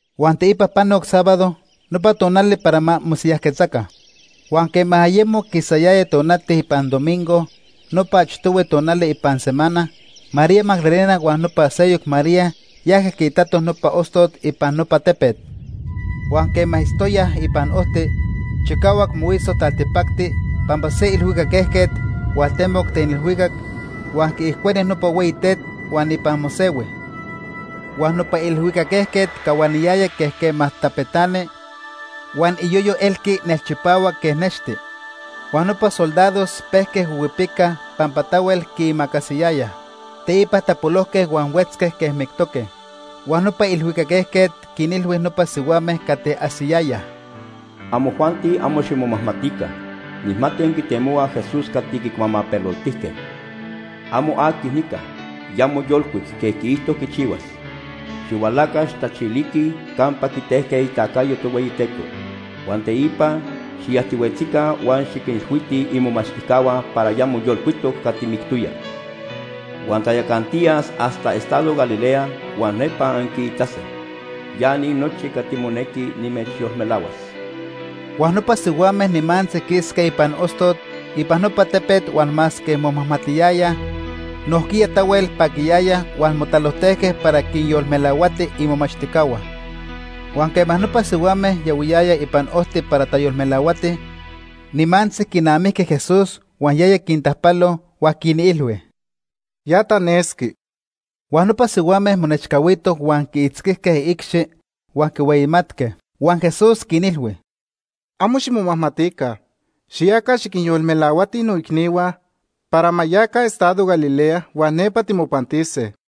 Huan teipa panoc sábado, nopa tonali para ma mosiyajquetzaca. Huan quema ayemo quisayaya tonati ipan domingo nopa achtohui tonali ipan semana, María Magdalena huan nopa seyoc María yajque quiitatoj nopa ostot ipan nopa tepet. Huan quema itztoyaj ipan ojti, chicahuac mohuiso taltipacti pampa se ilhuicac ejquet hualtemoc ten ilhuicac, huan quiijcueni nopa hueyi tet huan ipan mosehui. Huan nopa ilhuicac ejquet cahuaniyaya quej quema tapetani, huan iyoyo elqui nelchipahuac quej nexti. Huan nopa soldados pejque huihuipicaj pampa tahuel quiimacasiyayaj. Teipa tapolojque huan huetzque quej mictoque. Huan nopa ilhuicac ejquet quinilhui nopa sihuame cati ajsiyayaj: ―Amojuanti amo ximomajmatica. Nijmati anquitemohuaj Jesús cati quicuamapeloltijque. Amo aqui nica. Ya moyolcuic quej quiijto quichihuas. Xihualaca, xijtachiliquij campa quitejque itacayo Tohueyiteco. Huan teipa xiyajtihuetzica huan xiquinilhuitij imomachtijcahua para ya moyolcuitoc cati mictoya. Huan tayacantiyas hasta estado Galilea, huan nepa anquiitase. Ya ni nochi cati monequi nimechyolmelahuas. Huan nopa sihuame nimantzi quisque ipan ostot ipan nopa tepet huan masque momajmatiyayaj, nojquiya tahuel paquiyayaj huan motalojtejque para quinyolmelahuatij imomachtijcahua. Huan quema nopa sihuame yahuiyayaj ipan ojti para tayolmelahuatij, nimantzi quinamijque Jesús huan yaya quintajpalo, huan quinilhui: ―Ya tanesqui. Huan nopa sihuame monechcahuitoj huan quiitzquijque iicxi huan quihueyimatque. Huan Jesús quinilhui: ―Amo ximomajmatica. Xiyaca, xiquinyolmelahuatij noicnihua para ma yaca estado Galilea huan nepa timopantise.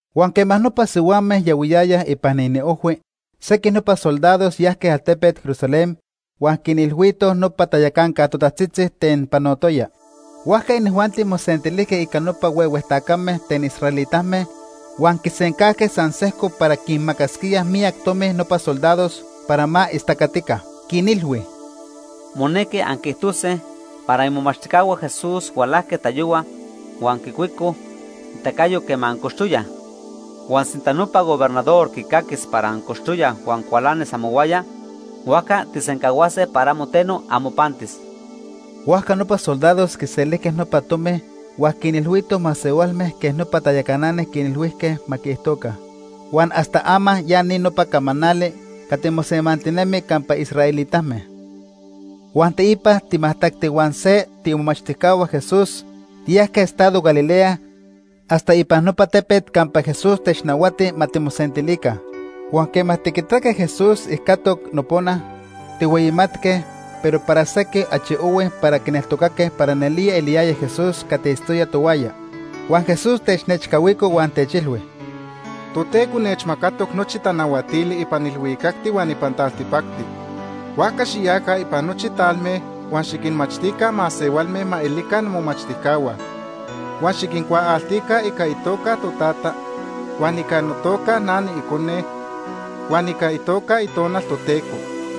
Huan quema nopa sihuame yahuiyayaj ipan iniojhui, sequij nopa soldados yajque altepet Jerusalén huan quinilhuitoj nopa tayacanca totajtzitzi ten panotoya. Huajca inijuanti mosentilijque ica nopa huehue tacame ten israelitame huan quisencajque san sejco para quinmacasquíaj miyac tomi nopa soldados para ma istacatica. Quinilhui: ―Monequi anquiijtose para imomachtijcahua Jesús hualajque tayohua huan quicuicoj itacayo quema ancochtoyaj. Huan sinta nopa gobernador quicaquis para ancochtoyaj huan cualanis amohuaya, huajca tijsencahuase para amo teno amopantis. Huajca nopa soldados quiselijque nopa tomi huan quinilhuitoj masehualme quej nopa tayacanani quinilhuijque ma quiijtoca. Huan hasta ama ya ni nopa camanali cati mosemantinemi campa israelitame. Huan teipa timajtacti huan se tiimomachtijcahua Jesús tiyajque estado Galilea hasta ipan nopa tepet campa Jesús technahuati ma timosentilica. Huan quema tiquitaque Jesús ijcatoc nopona, tijhueyimatque, pero para sequij achi ohui para quineltocaque para nelía eliyaya Jesús cati itztoya tohuaya. Huan Jesús technechcahuico huan techilhui: ―Toteco nechmacatoc nochi tanahuatili ipan ilhuicacti huan ipan taltipacti. Huajca xiyaca ipan nochi talme huan xiquinmachtica masehualme ma elica nomomachtijcahua. Huan xiquincuaaltica ica itoca O ica itequiticayo. Totata, huan ica notoca O ica notequiticayo. na niIcone, huan ica itoca O itequiticayo. Itonal Toteco.